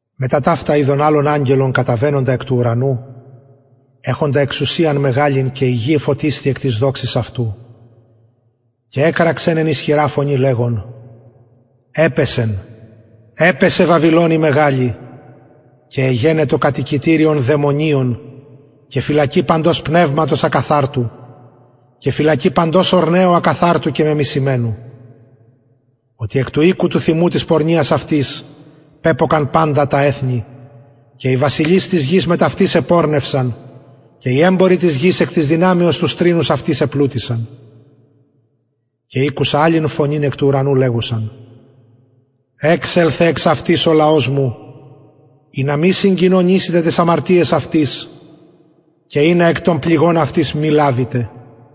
μετα ταυτα ειδον αλλον αγγελον καταβαινοντα εκ του ουρανου εχοντα εξουσιαν μεγαλην και η γη εφωτισθη εκ της δοξης αυτου και εκραξεν ισχυρα φωνη λεγων επεσεν βαβυλων η μεγαλη και εγενετο κατοικητηριον δαιμονων και φυλακη παντος πνευματος ακαθαρτου και φυλακη παντος ορνεου ακαθαρτου και μεμισημενου οτι εκ του οινου του θυμου της πορνειας αυτης πεπτωκασιν παντα τα εθνη και οι βασιλεις της γης μετ αυτης επορνευσαν και οι εμποροι της γης εκ της δυναμεως του στρηνους αυτης επλουτησαν και ηκουσα αλλην φωνην εκ του ουρανου λεγουσαν εξελθε εξ αυτης ο λαος μου ινα μη συγκοινωνησητε ταις αμαρτιαις αυτης και εκ των πληγων αυτης ινα μη λαβητε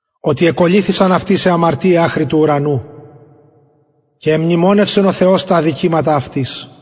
οτι εκολληθησαν αυτης αι αμαρτιαι αχρι του ουρανου και εμνημονευσεν ο θεος τα αδικηματα αυτης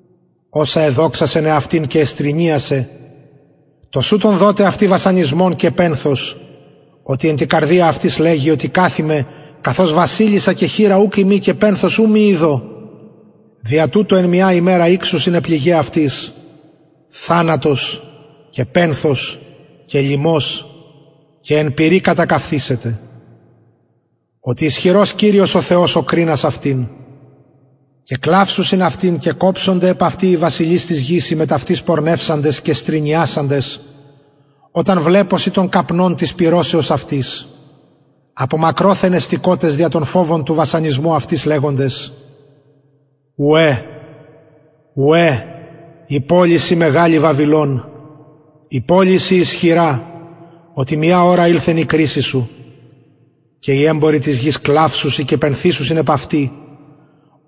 οσα εδοξασεν αυτην και εστρηνιασεν τοσουτον δοτε αυτη βασανισμον και πενθος οτι εν τη καρδια αυτης λεγει οτι καθημαι βασιλισσα και χηρα ουκ ειμι και πενθος ου μη ιδω δια τουτο εν μια ημερα ηξουσιν αι πληγαι αυτης θανατος και πενθος και λιμος και εν πυρι κατακαυθησεται οτι ισχυρος κυριος ο θεος ο κρινας αυτην και κλαυσουσιν και κοψονται επ αυτην οι βασιλεις της γης οι μετ αυτης πορνευσαντες και στρηνιασαντες οταν βλεπωσιν τον καπνον της πυρωσεως αυτης απο μακροθεν εστηκοτες δια τον φοβον του βασανισμου αυτης λεγοντες ουαι ουαι η πολις η μεγαλη βαβυλων η πολις η ισχυρα οτι μια ωρα ηλθεν η κρισις σου και οι εμποροι της γης κλαυσουσιν και πενθησουσιν επ αυτη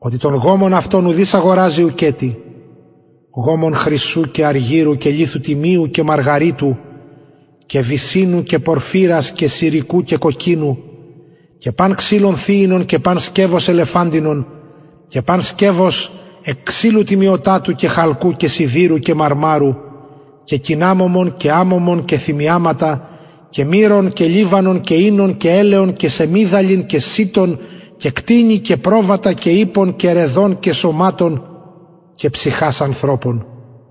οτι τον γομον αυτων ουδεις αγοραζει ουκετι γομον χρυσου και αργυρου και λιθου τιμιου και μαργαριτου και βυσσινου και πορφυρου και σηρικου και κοκκινου και παν ξυλον θυινον και παν σκευος ελεφαντινον και παν σκευος εκ ξυλου τιμιωτατου και χαλκου και σιδηρου και μαρμαρου και κιναμωμον και θυμιαματα και μυρον και λιβανον και οινον και ελαιον και σεμιδαλιν και σιτον και προβατα και κτηνη και ιππων και ραιδων και σωματων και ψυχας ανθρωπων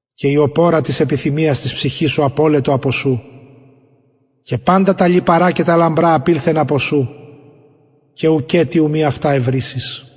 και η οπωρα της επιθυμιας της ψυχης σου απηλθεν απο σου και παντα τα λιπαρα και τα λαμπρα απωλετο απο σου και ουκετι αυτα ου μη ευρης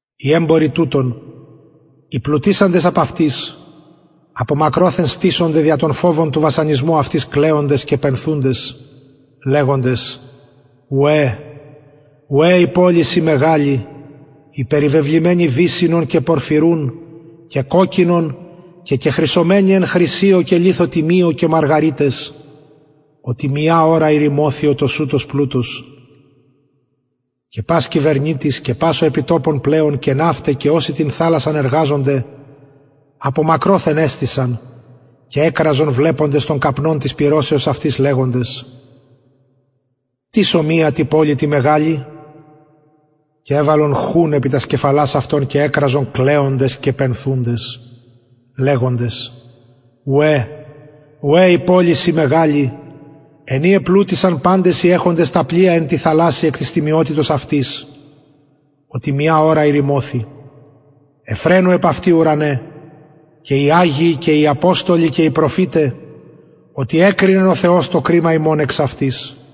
οι εμποροι τουτων οι πλουτησαντες απ αυτης απο μακροθεν στησονται δια τον φοβον του βασανισμου αυτης κλαιοντες και πενθουντες και λεγοντες ουαι ουαι η πολις η μεγαλη η περιβεβλημενη βυσσινον και πορφυρουν και κοκκινον και κεχρυσωμενη χρυσιω και λιθω τιμιω και μαργαριταις οτι μια ωρα ηρημωθη ο τοσουτος πλουτος και πας κυβερνητης και πας ο επι τοπον πλεων και ναυται και οσοι την θαλασσαν εργαζονται απο μακροθεν εστησαν και εκραζον βλεποντες τον καπνον της πυρωσεως αυτης λεγοντες τις ομοια τη πολει τη μεγαλη και εβαλον χουν επι τας κεφαλας αυτων και εκραζον κλαιοντες και πενθουντες και λεγοντες ουαι ουαι η πολις η μεγαλη εν η επλουτησαν παντες οι εχοντες τα πλοια εν τη θαλασση εκ της τιμιοτητος αυτης οτι μια ωρα ηρημωθη ευφραινου επ αυτη ουρανε και οι αγιοι και οι αποστολοι και οι προφηται οτι εκρινεν ο θεος το κριμα υμων εξ αυτης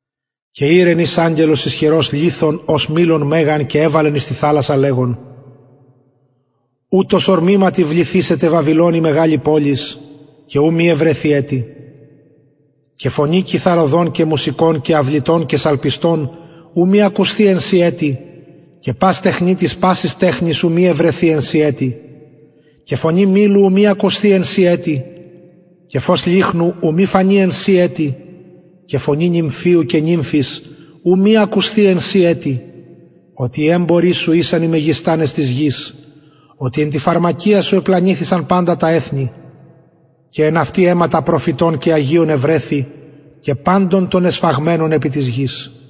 και ηρεν εις αγγελος ισχυρος λιθον ως μυλον μεγαν και εβαλεν εις την θαλασσαν λεγων ουτως ορμηματι βληθησεται βαβυλων η μεγαλη πολις και ου μη ευρεθη ετι και φωνη κιθαρωδων και μουσικων και αυλητων και σαλπιστων ου μη ακουσθη εν σοι ετι και πας τεχνιτης πασης τεχνης ου μη ευρεθη εν σοι ετι και φωνη μυλου ου μη ακουσθη εν σοι ετι και φως λυχνου ου μη φανη εν σοι ετι και φωνη νυμφιου και νυμφης ου μη ακουσθη εν σοι ετι οτι οι εμποροι σου ησαν οι μεγιστανες της γης οτι εν τη φαρμακεια σου επλανηθησαν παντα τα εθνη και εν αυτη αιματα προφητων και αγιων ευρεθη και παντων των εσφαγμενων επι της γης